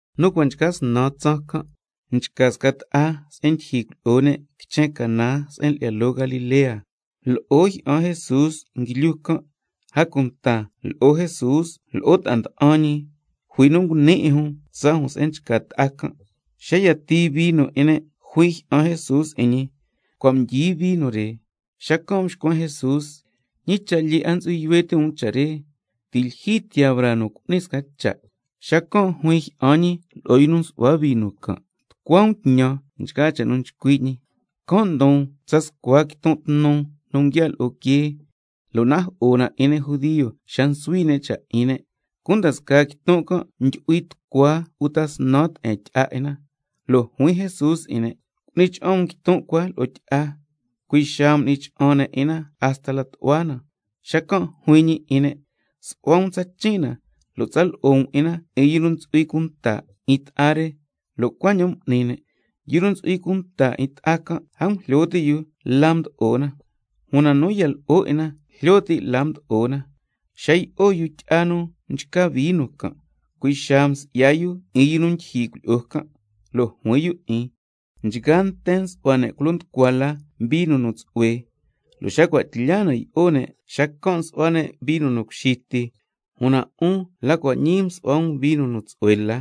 Nu cua' nchca snan tsaan can' nchca sca ta'a se'en ndyijyi cuilyi'o ne' quichen Caná se'en lyi'ya loo Galilea. Lo'o jyi'an Jesús nguilyu can'. A cunta lo'o Jesús lo'o ta'a nda'an ñi jui nu nguni 'in jun tsaa jun se'en nchca ta'a can'. Xa yatii vino 'in ne' juin jyi'an Jesús 'in ñi: Cua' mdyi vino re. Xacan' mxcuen Jesús: ¿Ñi cha' lyee 'a ntsu'hui yuhue ti' um cha' re? Ti' lyijyi tiyaa braa nu cu'nin sca cha'. Xacan' juin jyi'an ñi lo'o yu nu nsu'hua vino can': Tucua um tñan nchgaa cha' nu chcui' ñi. Can' ndon tsa scua quiton' tnu, nu nguiaa' lo'o quee lo' najo'o na 'in ne' judio xa nsuhui ne' cha' 'in ne'. Cunda scaa quiton' can' ndyu'hui tucua uta snan te'en tyi'a 'in na. Lo' juin Jesús 'in ne': Cu'ni cha'an um quiton' cua lo'o tyi'a. Cui' xaa m'ni cha'an ne' 'in na hasta la tu'hua na. Xacan' juin ñi 'in ne': Su'hua um tsachin' na, lo' tsa lo'o um 'in na 'in yu nu ntsu'hui cunta 'in ta'a re. Lo' cuaña'an m'ni ne'. Yu nu ntsu'hui cunta 'in ta'a can' a ngujlyo ti' yu la mdo'o na, una nu ya lo'o 'in na jlyo ti' la mdo'o na. Xa yi'o yu tyi'a nu mchca vino can', cui' xaa msi'ya yu 'in yu nu ndyijyi cuilyi'o can', lo' juin yu 'in: Nchgaa nten nsu'hua ne' culo nducua la vino nu tsu'hue, lo' xa cua' tlya na yi'o ne', xacan' nsu'hua ne' vino nu cuxi ti, una 'un la cua' ñii msu'hua um vino nu tsu'hue la.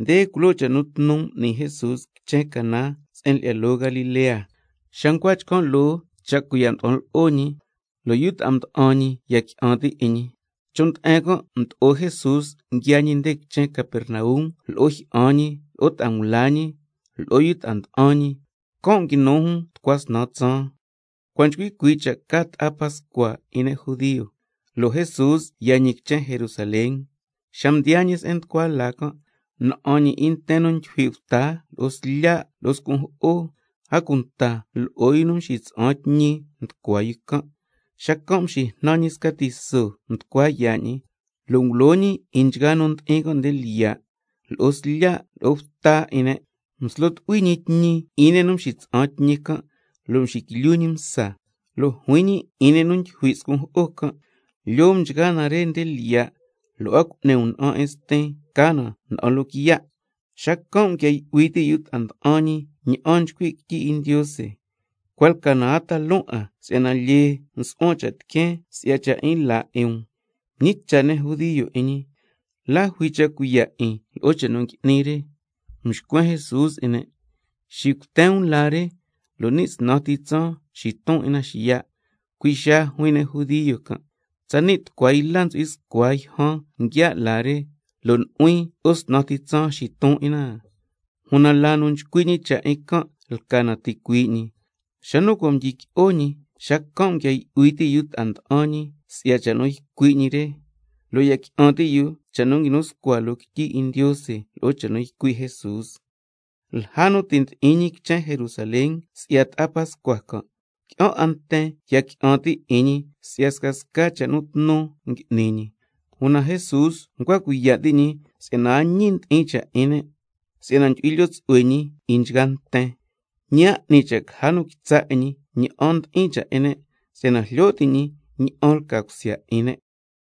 Nde culoo cha' nu tnu m'ni Jesús quichen Caná se'en lyi'ya loo Galilea, xa ncua chcan' loo cha' cuiya' nda'an lo'o ñi, lo' yu ta'a nda'an ñi ya qui'an ti' 'in ñi. Chon' nde'en can' mdo'o Jesús nguiaa ñi nde quichen Capernaum tsatlyu lo'o jyi'an ñi lo'o ta'a ngula ñi, lo'o yu ta'a nda'an ñi. Can' nguinu jun tucua snan tsaan. Cua' nchcui cuii' cha' ca ta'a pascua 'in ne' judio, lo' Jesús yaa ñi quichen Jerusalén. Xa mdiyaa ñi se'en nducua laa can', na'an ñi 'in nten nu ndyijui' bta lo'o slya' lo'o scun' jo'o, a cunta lo'o yu nu nxitsa'an tñi nducua yu can'. Xacan' mxijnan ñi sca tiso nducua yaa' ñi, lo' ngulo ñi 'in nchgaa nu ndi'in can' nde lyiya', lo'o slya' lo'o bta 'in ne', mslo tu'hui ñi tñi 'in ne' nu nxitsa'an tñi can', lo' mxiquilyu ñi msa, lo' juin ñi 'in ne' nu ndyijui' scun' jo'o can': Lyoo um nchgaa na re nde lyiya', lo' a cu'ni um na'an 'in Stin ca na na'an loquiya'. Xacan' nguia yu'hui ti' yu ta'a nda'an ñi ña'an nchcui' quityi 'in Ndiose: Cua' lca na a ta loon 'an si'yana lyee nsu'huan cha' tiqueen si'ya cha' 'in laa 'in um. Mñicha' ne' judio 'in ñi: ¿La jui cha' cuiya' 'in lo'o cha' nu ngui'ni re? Mxcuen Jesús 'in ne': Xicuten um laa re, lo' ni' snan ti tsaan xiton 'in na xiya'. Cui' xaa juin ne' judio can': Tsani' tucua yla ntsu'hui scua yjan nguiaa' laa re, ¿lo' nu'huin lo'o snan ti tsaan xiton 'in na xiya'? Una laa nu nchcui' ñi cha' 'in can' lca na ticuii' ñi. Xa nu cua' mdyiqui'o ñi, xacan' nguia yu'hui ti' yu ta'a mda'an ñi si'ya cha' nu ycui' ñi re, lo' ya qui'an ti' yu cha' nu nguinu scua loo quityi 'in Ndiose lo'o cha' nu ycui' Jesús. Lja nu ti' ndi'in ñi quichen Jerusalén se'en nchca ta'a pascua can', qui'an 'a nten ya qui'an ti' 'in ñi si'ya scasca cha' nu tnu ngui'ni ñi. Una Jesús ncua cuiya' ti' ñi si'yana a ñi ndi'in cha' 'in ne', si'yana ndyu'hui lyoo tsu'hue ñi 'in nchgaa nten, ñi a 'ni cha' caja nu quitsa' 'in ñi ña'an ndi'in cha' 'in nten, si'yana jlyo ti' ñi ña'an lca cusya 'in ne'.